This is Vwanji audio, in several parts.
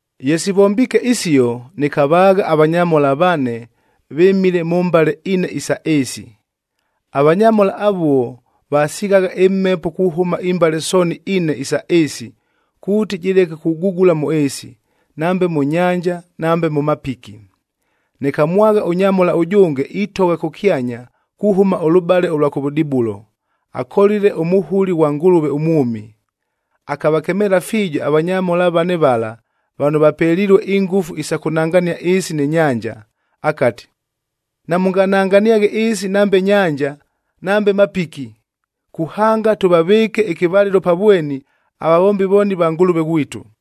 Ye sivombiike isio, nɨkavaagha avanyamhola vane, vɨmile mʉ mbale ine isa ɨɨsi. Avanyamhola avuo vasighagha ɨmhepo kuhʉma imbale sooni ine isa ɨɨsi kuuti jɨleke kugugula mʉ ɨɨsi, nambe mʉ nyanja nambe mʉ mapiki. Nɨkamwagha ʉnyamhola ʉjʉnge itogha kʉkyanya kuhʉma ʉlʉbale ʉlwa kʉvʉdibulo, akolile ʉmuhuli ghwa Ngʉlʉve ʉmwʉmi. Akavakemeela fiijo avanyamhola vane vala vano vapelilue ingʉfu isa kʉnangania ɨɨsi nɨ nyanja, akati, “Namʉngananganiaghe ɨɨsi nambe nyanja, nambe mapiki, kuhanga tʉvavɨɨke ɨkɨvalɨlo pa vweni avavombi vooni va Ngʉlʉve ghwitu.”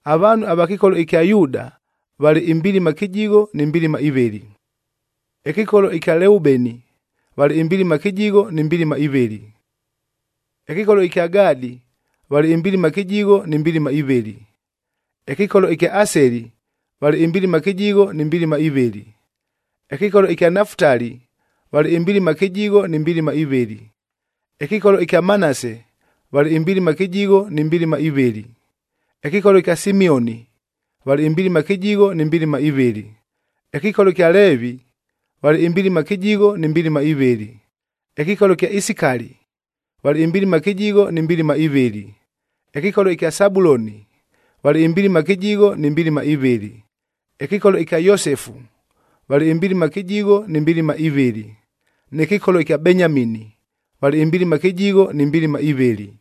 Avaanhu ava kɨkolo ɨkya Yuuda valɨ imbilima kɨjigho ni mbilima ivɨlɨ, ɨkɨkolo ɨkya Leubeni valɨ imbilima kɨjigho ni mbilima ivɨlɨ, ɨkɨkolo ɨkya Gadi valɨ imbilima kɨjigho ni mbilima ivɨlɨ. Ɨkɨkolo ɨkya Aseli valɨ imbilima kɨjigho ni mbilima ivɨlɨ, ɨkɨkolo ɨkya Nafutali valɨ imbilima kɨjigho ni mbilima ivɨlɨ, ɨkɨkolo ɨkya Manase valɨ imbilima kɨjigho ni mbilima ivɨlɨ. Ɨkɨkolo ɨkya Simioni valɨ imbilima kɨjigho ni mbilima ivɨlɨ, ɨkɨkolo ɨkya Leevi valɨ imbilima kɨjigho ni mbilima ivɨlɨ, ɨkɨkolo ɨkya Isikali valɨ imbilima kɨjigho ni mbilima ivɨlɨ. Ɨkɨkolo ɨkya Sabuloni valɨ imbilima kɨjigho ni mbilima ivɨlɨ, ɨkɨkolo ɨkya Yosefu valɨ imbilima kɨjigho ni mbilima ivɨlɨ, nɨ kɨkolo ɨkya Benyamini valɨ imbilima kɨjigho ni mbilima ivɨlɨ.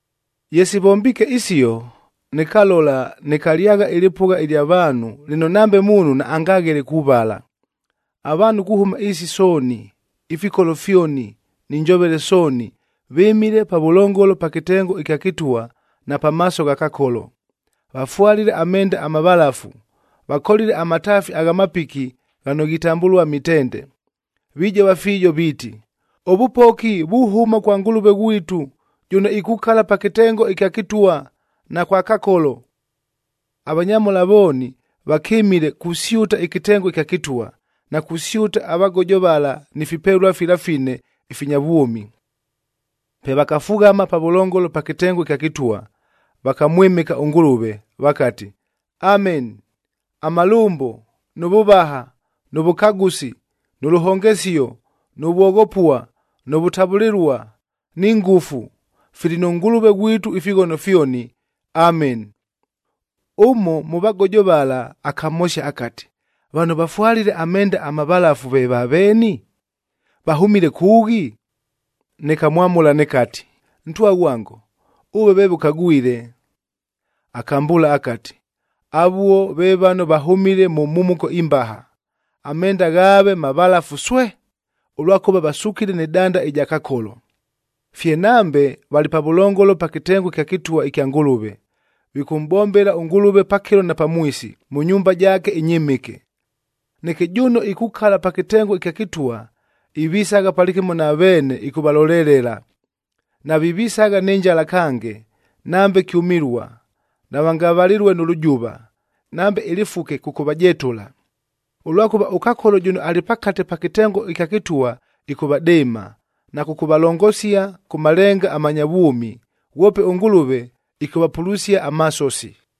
Ye sivombiike isio, nɨkalola nɨkalyagha ɨlɨpʉgha ɨlya vaanhu lɨno nambe muunhu naangaghele kuvala. Avaanhu kuhʉma ɨɨsi sooni, ifikolo fyoni ni njovele sooni vɨmile pavʉlongolo pa kɨtengo ɨkya kɨtwa na pamaaso gha Kakolo, vafwalile amenda amavalafu, vakolile amataafi agha mapiki ghano ghitambʉlua mitende. Vijova fiijo viiti, “Ʉvʉpoki vuhʉma kwa Ngʉlʉve ghwitu, jʉno ikukala pa kɨtengo ɨkya kɨtwa, na kwa Kakolo.” Avanyamhola vooni vakɨmile kusyʉta ɨkɨtengo ɨkya kɨtwa, na kusyʉta avagojo vala ni fipelua fila fine ifinya vwʉmi. Pe vakafughama pavʉlongolo pa kɨtengo ɨkya kɨtwa, vakamwɨmɨka ʉNgʉlʉve, vakati, “Ameni! Amalʉmbo, nʉ vʉvaha, nʉ vʉkagʉsi, nʉ lʉhongesio, nʉ vwoghopua, nʉ vʉtavʉlɨlua, ni ngʉfu, fili nʉ Ngʉlʉve ghwitu ifighono fyoni. Ameni!” Ʉmo mʉ vagojo vala akamhosia akati, “Vano vafwalile amenda amavalafu ve vaveeni? Vahʉmile kʉʉghi?” Nɨkamwamʉla nɨkati, “Ntwa ghwango, ʉve veeve ʉkagwile.” Akambʉʉla akati, “Avuo ve vano vahʉmile mʉ mhumuko imbaha, amenda ghaave mavalafu swee, ʉlwakʉva vasukile nɨ danda ɨja Kakolo. Fye nambe valɨ pavʉlongolo pa kɨtengo ɨkya kɨtwa ɨkya Ngʉlʉve. Vikʉmʼbombela ʉNgʉlʉve pakɨlo na pamwisi mʉ nyumba jaake ɨnyɨmɨke. Neke jʉno ikukala pa kɨtengo ɨkya kɨtwa ivisagha palɨkɨmo na veene ɨkʉvalolelela. Navivisagha nɨ njala kange, nambe kyʉmɨlua. Navangavalɨlue nʉ lʉjʉva, nambe ɨlɨfuke kʉkʉvajetʉla. Ʉlwakʉva, ʉKakolo jʉno alɨ pakate pa kɨtengo ɨkya kɨtwa ɨkʉvadɨɨma na kʉkʉvalongosia kʉ malenga amanya vwʉmi. Ghwope ʉNgʉlʉve ɨkʉvapulusia amasosi.”